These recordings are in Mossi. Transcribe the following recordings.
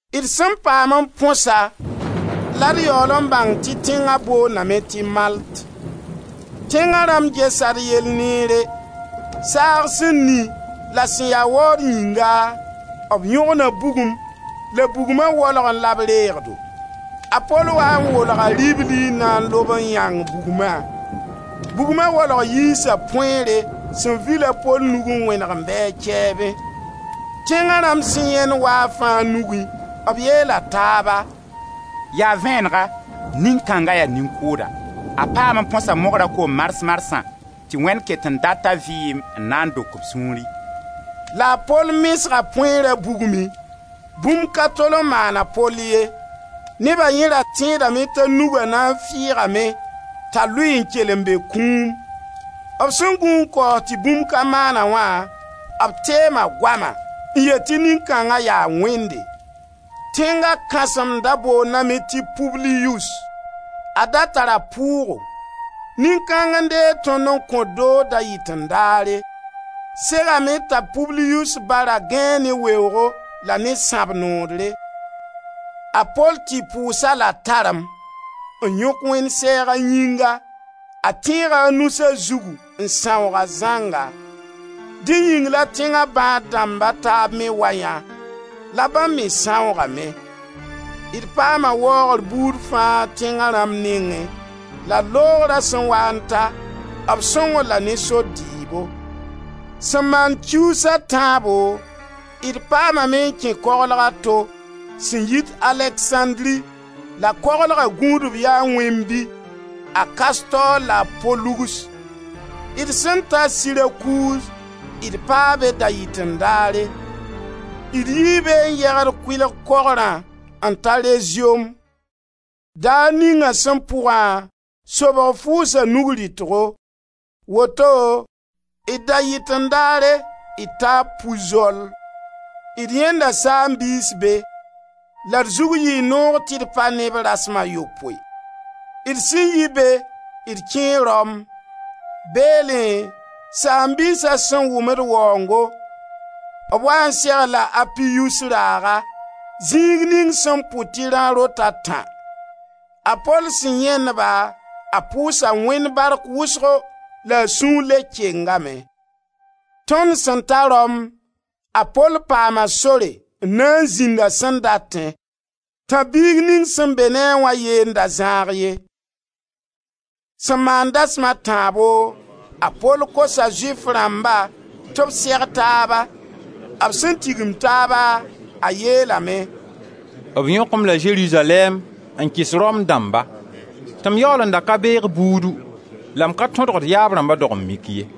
D sẽn paam n põsa la d yaool n bãng tɩ tẽnga boondame tɩ Malt. Tẽnga rãmb gesa d yell neere. Saag sẽn ni la sẽn ya waood yĩnga, b yõgna bugum la bugma waolgẽ la b reeg-do. A Pol waa n wolga ribli n na n lob n yãng bugma. Bugma waolg yiisa põeere sẽn vil a Pol nug n wẽneg n be a kɛɛbẽ. Tẽnga rãmb sẽn yãend waafã a nugẽ, b yeela taaba: «Yaa vẽnega, nin-kãnga yaa nin-kʋʋda; a paam n põsa mogra koom mars-marsã, tɩ Wẽnd ket n data vɩɩm n na n dok b sũuri.» La a Pol mesga põeera bugmẽ. Bũmb ka tol n maan a Pol ye. Neba yẽ ra tẽedame t'a nuga na n fɩɩgame t'a lʋɩ n kell n be kũum. B sẽn gũ n kaoos tɩ bũmb ka maan-a wã, b teema goama n yet tɩ nin-kãnga yaa wẽnde. Tẽnga kãsem da boondame tɩ Ypbliyus. A da tara pʋʋgo. Nin-kãng n deeg tõnd n kõ-d doog da-yɩten-daare. Segame t'a Ypbliyus ba ra gãee ne weoogo la ne sãb-noodre. A Pol tɩ pʋʋs-a la tarem, n yõk Wẽnd sɛɛg a yĩnga, a tẽega a nus a zugu, n sãoog-a zãnga. Dẽ yĩng la tẽnga bãad-dãmb a taaba me wayã, la bãmb me sãoogame. D paama waoogr buud fãa tẽnga rãmb nengẽ la d loogra sẽn waa n ta, b sõng-d la ne sor dɩɩbo. Sẽn maan kiuus a tãabo, d paamame n kẽ koglg a to, sẽn yit Aleksãndri, la koglga gũudb yaa wẽnd-bi, a Kastor la a Polugs. D sẽn ta Sirakuz, d paa be da-yɩten-daare. D yii be n yegd kʋɩl kogrã n ta Reziom. Daar ninga sẽn pʋgã, sobg fʋʋsa nug rɩtgo; woto, d da-yɩten-daare, d taa Ypzol. D yãenda saam-biis be. La d zug yɩɩ noog tɩ d pa ne b rasem a yopoe. D sẽn yi be d kẽe Rom. Beelẽ saam-biisa sẽn wʋm d waoongo, b waa n seg-d la a Apiyus raaga, zĩig ning sẽn pʋd tɩ Rã-rot-a-tã. A Pol sẽn yãend-ba, a pʋʋsa Wẽnd bark wʋsgo la a sũur le kengame. Tõnd sẽn ta Rom, a Pol paama sore n na n zĩnd a sẽn datẽ, tãb-biig ning sẽn be ne a wã yee n da zãag ye. Sẽn maan dasem a tãabo a Pol kosa Zʋɩf rãmba tɩ b seg taaba. B sẽn tigim taaba, a yeelame: «B yõk-m la Zerizalɛɛm n kɩs Rom dãmba tɩ m yaool n da ka beeg buudu la m ka tõdg d yaab rãmba dog-n-mik ye.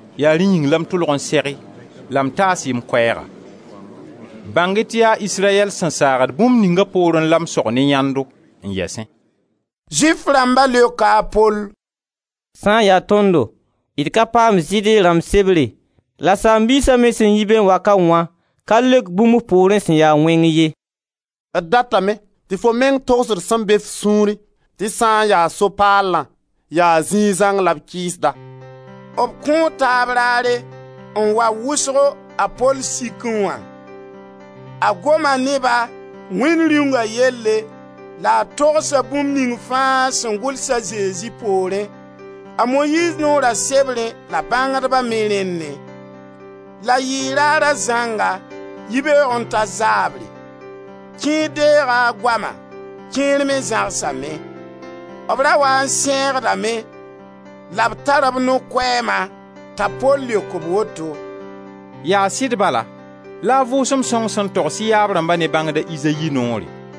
Ya rẽ yĩng la m tʋlg n seg-y la m taas-y m koɛɛga; bãng-y tɩ yaa Israyɛl sẽn saagd bũmb ninga poorẽ la m sog ne yãndo, n yɛsẽ.» Zʋɩf rãmba leoka a Pol: «Sã n ya tõndo d ka paam Zɩɩde rãmb sebre la saam-biisa me sẽn yi be n wa wã ka leok bũmb f poorẽ sẽn ya wẽng ye. D datame tɩ fo meng togs-d sẽn be f sũurẽ tɩ sã n ya So-paalã, yaa zĩig zãng la b kɩɩsda.» B kõo taab raare n wa wʋsgo a Pol sikẽ wã. A goma ne ba Wẽnd Rĩunga yelle la a togsa bũmb ning fãa sẽn gʋls a Zezi poorẽ, a Moyiiz Noora sebrẽ la bãngdba me rẽnnẽ. La yɩɩ raara zãnga, yibeoog n ta zaabre. Kẽer deega a goama, kẽer me zãgsame. B ra waa n sẽegdame la b tar b no-koɛɛma t'a Pol leok-b woto: «Yaa sɩd bala la a Vʋʋsem Sõng sẽn togs y yaab rãmba ne bãngda Izayi noore: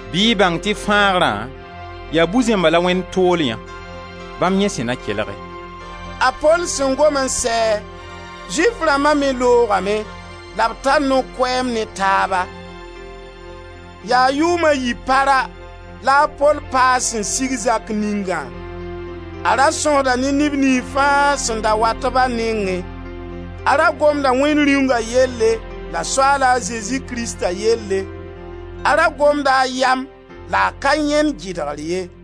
Bɩ y bãng tɩ fãagrã yaa bu-zẽmba la Wẽnd tool yã. Bãmb yẽ sẽ na kelge.» [ A Pol sẽn gom n sɛ, Zʋɩf rãmba me loogame la b tar no-koɛɛm ne taaba.] Yaa yʋʋm a yi para la a Pol paa a sẽn sig zak ningã. A ra sõsda ne neb niyns fãa sẽn da wat-b a nengẽ. A ra gomda Wẽnd Rĩunga yelle la Soaala Zezi Krista yelle. A ra gomda a yam la a ka yãend gɩdgr ye.